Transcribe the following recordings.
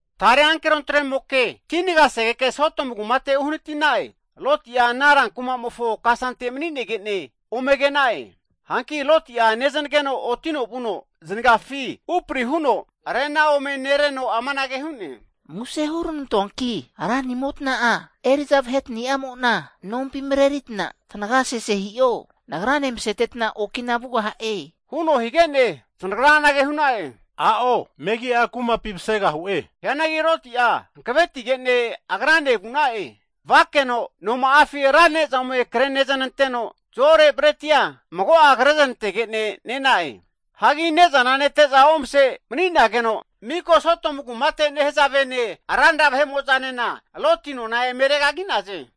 Tare ankero tremoke kinagasegeke Sodomu kumate uhanati'na'e. Loti'a ana ra kumamofo kasante mani'nege'ne ome ke'na'e. Hanki Loti'a neznageno otino vuno zanagafi upari huno, arena ome nereno amanage hu'ne. Muse huranantoanki ranimota'a eri'za vahetani'amo'na nompi marerita tanaga sese hi'o. Nagrane maseteta okina vugaha'e, huno hige'ne zanagra anage hu'na'e. A'o, megi'a kumapi masegahu'e. Hianagi Loti'a hankavetigene agrane vu'na'e. Vakeno noma'afi ra ne'za ome kre neznanteno zo'ore bretia mago'a kre znantegene ne'na'e. Hagi ne'zana nete'za omase mani'nageno, miko Sodomu kumate nehazavene ranra vahe'mo'zanena Loti nona eme regagi'naze.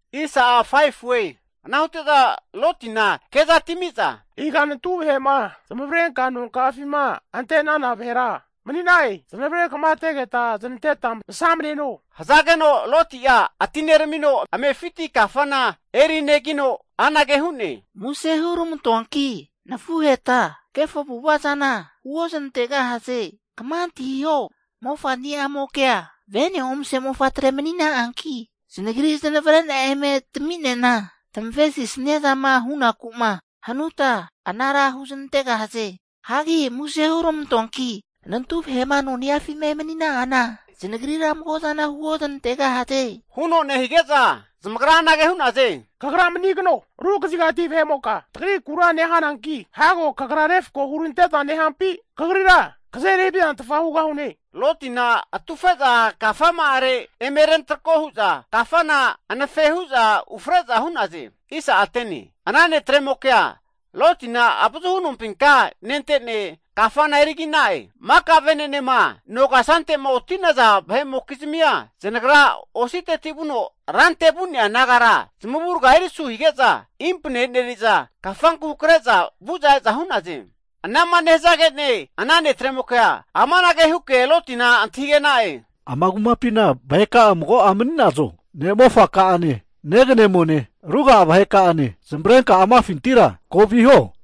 Ana hute'za Lotina ke'za atimi'za, Iga nantu vahe'ma zanavrenkama nonka'afima ante'nana vahera mani'na'e? Zanavre kamategeta znanteta masamaneno. Hazageno Loti'a atineramino amefiti kafana eri negino, anage hu'ne, Muse hurmantoanki nafuheta kefo avu'ava zana huoznantegahaze. Kama antahiho, mofani'amokea vene omase mofatre manina'anki, zanagri zanavre'na eme tami'nena tamavesinia zama hunaku'ma hanuta anara huznantegahaze. Hagi muse (plis) hurmantoanki nantu vahe'ma noni'afima emanina'ana zanagrira mago'zana huoznantegahaze. Huno nehige'za zamagra anage hu'naze, Kagra manigano! Ru kazigati vahe'moka tagrikura nehananki, hago kagra refko hurante'za nehampi, kagrira kazeri havizantfa hugahune. Lotina atufe'za kafama'are eme rentrako hu'za kafana anafe hu'za ufre'za hu'naze. Ana netremokea Lotina avazuhu nompinka nente'ne, kafana erigi'na'e. Maka vene'nema no kasante'ma oti'naza vahe'mokizmia zanagra ositeti vuno rante vu'nea nagara zamavurga erisu hige'za impane eneri'za, kafanku hakre'za vu'za e'za hu'naze. Anama nehazage'ne ana netremokea amanage huke Lotina antahige'na'e, Ama kumapina vaheka'a mago'a mani'nazo? Ne'mofaka'ane, neganemone, ruga'a vaheka'ane zamavarenka amafintira ko viho.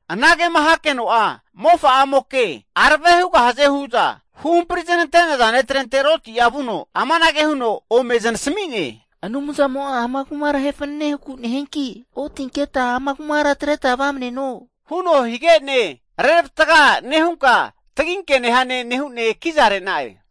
Anagema hakeno'a mofa'amoke arave hugahaze hu'za huhampri znante'naza ne'trente Loti'a vuno amanage huno ome zanasami'ne, Anumzamo'a ama kumara ahe fanane huku nehianki otinketa ama kura atreta vamaneno, huno hige'ne, reravatga nehunka taginke nehane nehu'ne kiza re'na'e.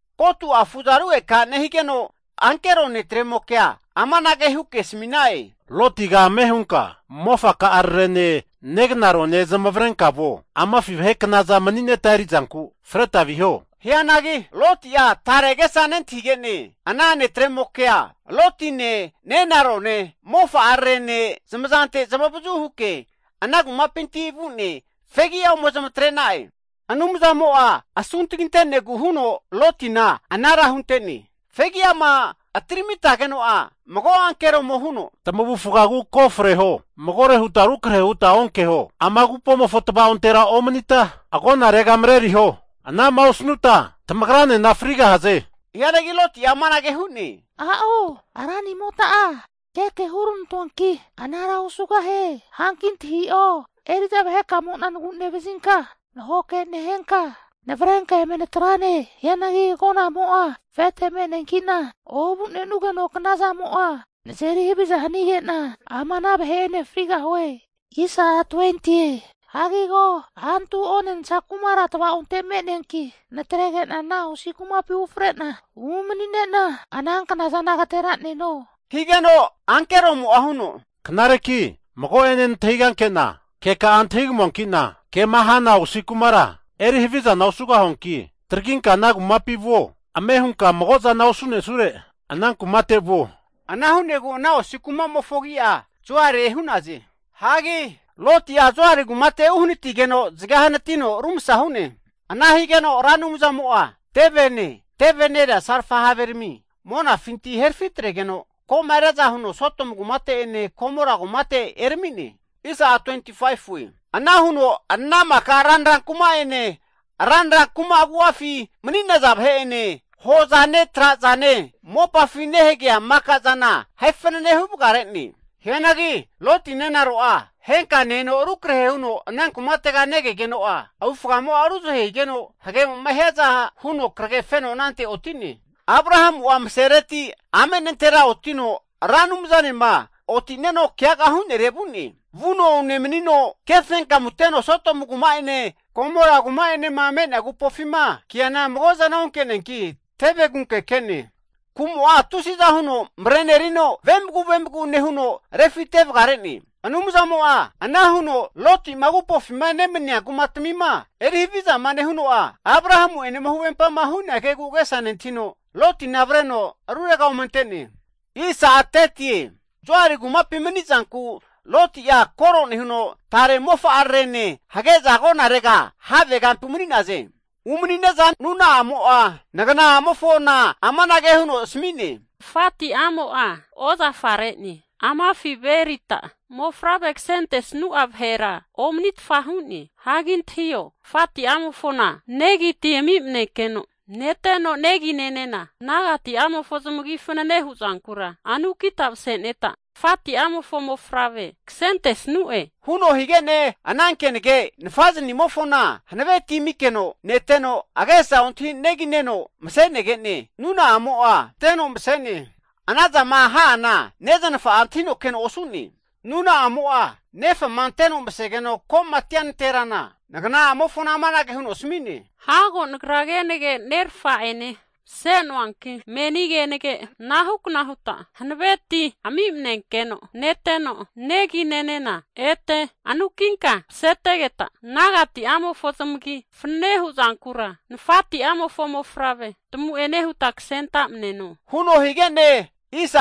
Ko'atu afu'za rugeka nehigeno ankero netremokea amanage huke asami'na'e, Lotiga ame' hunka mofaka'ararene, negnarone zamavarenka vuo. Amafi vahe knaza mani'neta erizanku freta viho. Hianagi Loti'a tare agesa nentahige'ne, ana netremokea Lotine, nenarone, mofa'ararene zamazante zamavazu huke, ana kumapinti vu'ne fegi'a ome zamatre'na'e. Anumzamo'a asuntaginte'negu huno Lotina anara hunte'ne. Fegiama atiramitageno'a, mago ankeromo huno, Frisagi ko' atreta freho! Magore huta rukrahera huta onkeho, ama agupomofo tvaontera omanita agonarega mareriho. Anama osanuta tamagranena frigahaze. Hianagi Loti'a amanage hu'ne, A'o! Ranimota'a keke huranantonki, anara osugahie! Hanki antahio, eri'za vahekamo'na nagu'nevazinka, nahoke nehenka navrenka eme natrane. Hianagi agonamo'a afete me'neankina ovu'nenugeno knazamo'a nazeri haviza hanige'na, ama ana vahe'ene frigahue. Hagi ko, antu onensa kumara tava'onte me'neanki, natrege'na ana osi kumapi fre'na umani'nena, ana knazana agatera'neno. Higeno ankeromo'a huno, Knareki mago'ene nantahiganke'na keka'a antahigamuankina kema hana osi kumara eri havizana osugahuanki traginka ana kumapi vuo. Ame hunka mago'zama osunesure ana kumate vuo. Ana hu'negu ana osi kuma'mofo agi'a Zoari hu'naze. Hagi Loti'a Zoari kumate uhanatigeno zage hanatino rumasa hu'ne. Ana higeno Ra Anumzamo'a tevene, teve nerea salfa haverami monafinti herafitregeno ko'ma riaza huno Sodomu kumate'ene Gomora kumate erami'ne. Ana huno ana maka ranra kuma'ene, ranra kuma agu'afi mani'naza vahe'ene, hozane, trazane, mopafi nehagea maka'zana ahe fanane huvagare'ne. Hianagi Loti nenaro'a henka ne-eno rukrahe huno ana kumatega negegeno'a, avufgamo'a ruzahe higeno hagemo'ma hiaza huno krage feno anante oti'ne. Abrahamu'a masereti ame nantera otino Ra Anumzanema oti'neno keaga hu'nere vu'ne. Vuno unemanino ke fenkamu teno Sodomu kuma'ene, Gomora kuma'enema me'nea agupofima keana mago'zana onke'neanki teve kunke ke'ne. Kumo'a tusiza huno marenerino vemagu vemagu nehuno refite vagare'ne. Anumzamo'a ana huno Loti'ma agupofima nemania kumatamima eri havizama nehuno'a, Abrahamu'enema huvempama hu'nea kegu agesa nentahino, Lotina avreno rurega ome ante'ne. Zoari kumapi mani'zanku Loti'a koro nehuno tare mofa'arare'ne hage'za agonarega havegampi umani'naze. Umani'ne'za nuna'amo'a ngana'amofona amanage huno asami'ne, Nafati'amo'a ozafa re'ne. Amafi ve erita mofavre kasentesnu'a vahera omanitfa hu'ne. Hagi antahio, tafati'amofona negi ti ami'manenkeno neteno negi nenena nagatimofo zamagi fanane hu'zankura anukita mase'neta, tafati'amofo mofavre kasentesanu'e. Huno hige'ne ana kenage nafaznimofona hanave ti amikeno neteno, agesa ontahi negi neno mase'negene, nuna'amo'a anteno mase'ne. Anazama ha'ana neznafa'a antahino keno osu'ne. Nuna'amo'a nefama anteno masegeno komatia nanterana, nagana'amofona amanage huno asami'ne, Hago nagra kenage nerafa'ene mase'noanki meni kenage anahu kna huta hanave ti ami'manenkeno neteno, ete negi nenena anukinka masetegeta, nagati'amofo zamagi fanane huzankura nafati'amofo mofavre tamu'ene huta kasenta'maneno, huno hige'ne,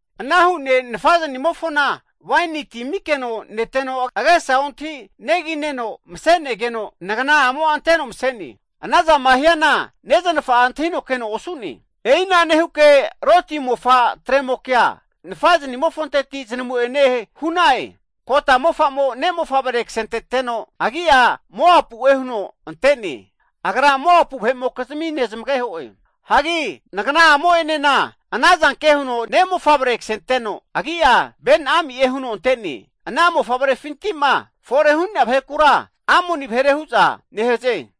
ana hu'ne nafa'zanimofona waini ti amikeno neteno agesa ontahi negineno masenegeno nagana'amo anteno mase'ne. Anazama hiana neznafa'a antahino keno osu'ne. E'ina nehuke, Loti mofa tremokea nafa'zanimofonteti zanamu'ene hu'na'e. Kota mofa'mo ne'mofavre kasenteteno, agi'a Moapu'e huno ante'ne, agra Moapu vahe'mokizmi nezmageho'e. Hagi nagana'amo enena ana zanke huno ne' mofavre kasenteno, agi'a Ben-Ammi'e huno ante'ne. Ana mofavrefinti'ma fore hu'nea vahekura Amoni vahere hu'za nehaze.